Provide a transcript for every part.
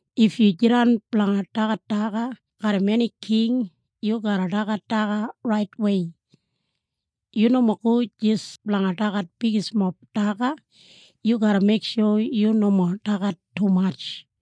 If yu jidan blanga dagat daga garram eni king yu garra dagat daga raitwei. Yu nomo go jis blanga dagat bigismob daga. Yu garra meiksho yu nomo dagat tumatj.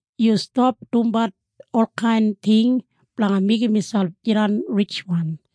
Yu stap dumbat olkain ting blanga meigim miselp jidan ritjwan.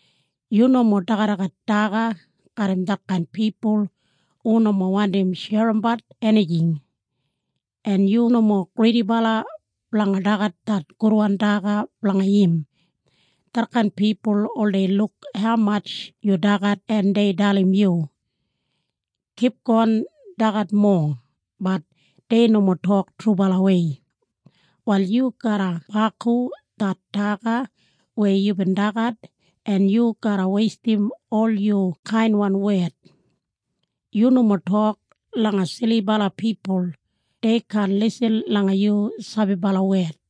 Yu nomo dagadagat daga garram detkain pipul hu nomo wandim sherimbat enijing, en yu nomo gridibala blanga dagat det gudwan daga blanga im. Detkain pipul oldei luk haumatj yu dagat en dei dalim yu, “Kipgon dagat mowa,” bat dei nomo tok trubalawei. Wal yu garra baku det daga weya yubin dagat en yu garra weistim ol yu kainwan wed. Yu nomo tok langa silibala pipul. Dei kaan lisin langa yu sabibala wed.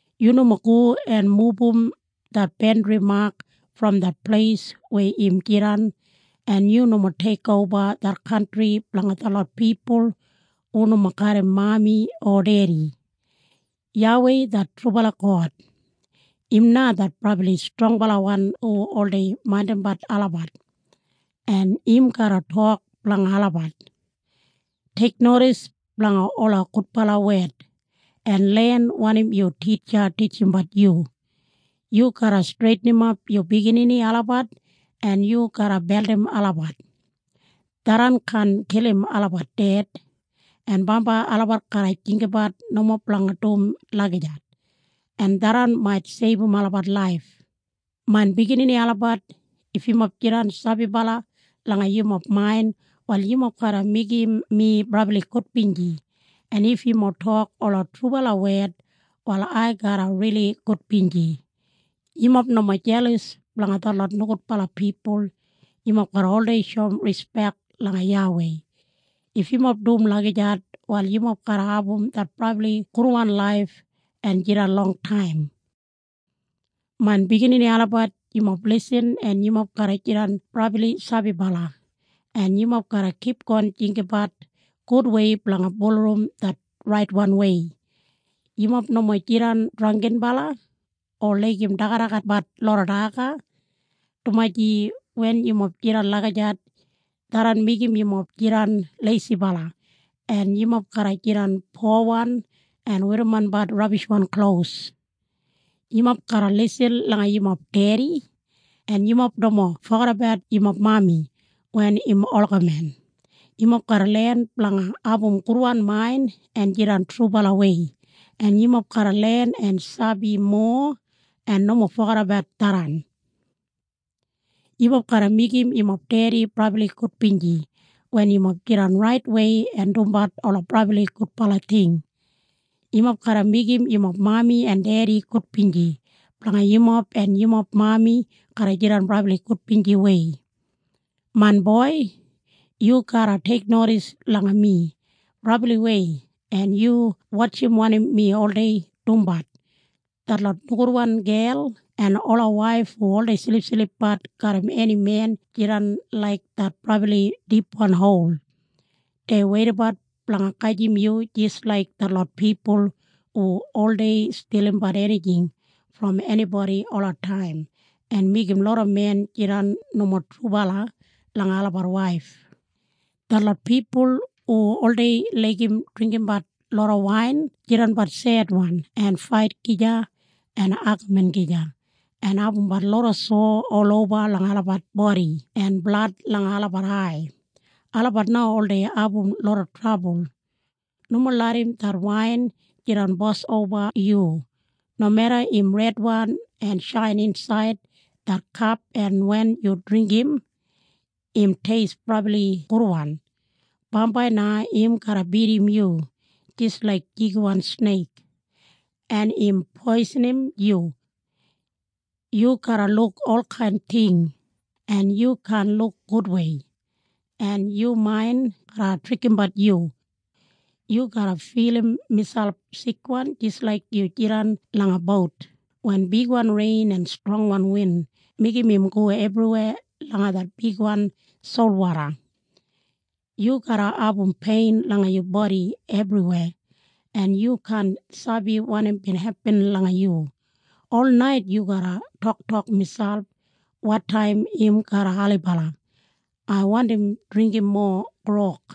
Yu nomo go en mubum det bandri mak brom det pleis weya im jidan en yu nomo teikoba det kantri blanga detlot pipul hu nomo garram mami o dedi. YAWEI det trubala God, im na det brabli strongbalawan hu oldei maindimbat olabat, en im garra tok blanga olabat. Teiknodis blanga ola gudbala wed en len wanim yu titja titjimbat yu. Yu garra streitinimap yu biginini olabat en yu garra beldim olabat. Tharran kaan kilim olabat ded, en bambai olabat garra jinggabat nomo blanga dum lagijat, en tharran mait seibum olabat laif. Main biginini olabat, if yumob jidan sabibala langa yumob main, wal yumob garra meigim mi brabli gudbinji. En if yumob tok ola trubala wed, wal ai garra rili gudbinji. Yumob nomo jelas blanga detlot nogudbala pipul. Yumob garra oldei shoum rispek langa YAWEI. If yumob dum lagijat, wal yumob garra abum det brabli gudwan laif en jidan longtaim. Main biginini olabat, yumob lisin en yumob garra jidan brabli sabibala, en yumob garra kipgon jinggabat gudwei blanga bulurrum det raitwanwei. Yumob nomo jidan drangginbala o laigim dagadagatbat loda daga, dumaji wen yumob jidan lagijat, tharran meigim yumob jidan leisibala en yumob garra jidan powan en werrimonbat rabishwan klos. Yumob garra lisin langa yumob dedi en yumob nomo fogedabat yumob mami wen im olgamen. Yumob garra len blanga abum gudwan main en jidan trubalawei, en yumob garra len en sabi mowa en nomo fogedabat tharran. Yumob garra meigim yumob dedi brabli gudbinji wen yumob jidan raitwei en dumbat ola brabli gudbala ting. Yumob garra meigim yumob mami en dedi gudbinji blanga yumob en yumob mami garra jidan brabli gudbinjiwei. Main boi, yu garra teiknodis langa mi brabliwei en yu wotjim wanim mi oldei dumbat. Detlot nogudwan gel en ola waif hu oldei silipsilipbat garram eni men jidan laik det brabli dipwan hol. Dei weidabat blanga gajim yu jis laik detlot pipul hu oldei stilimbat enijing brom enibodi olataim en meigim loda men jidan nomo trubala langa olabat waif. Detlot pipul hu oldei laigim dringgimbat loda wain jidanbat sedwan en fait gija en agamin gija, en abumbat loda sowa oloba langa olabat bodi en blad langa olabat ai. Olabat na oldei abum loda trabul. Nomo larram det wain jidan bos oba yu, nomeda im redwan en shain insaid det kap en wen yu dringgim, im teist brabli gudwan. Bambai na im garra bidim yu jis laik jigiwan sneik, en im poisinim yu. Yu garra luk olkain ting en yu kaan luk gudwei en yu main garra trikimbat yu. Yu garra filim miselp sikwan jis laik yu jidan langa bout wen bigwan rein en strongwan win meigim im go ebriweya langa det bigwan solwoda. Yu garra abum pein langa yu bodi ebriweya en yu kaan sabi wanim bin hepin langa yu. Olnait yu garra toktok miselp, “Wotaim im garra ailibala? Ai wandim dringgim mowa grog.”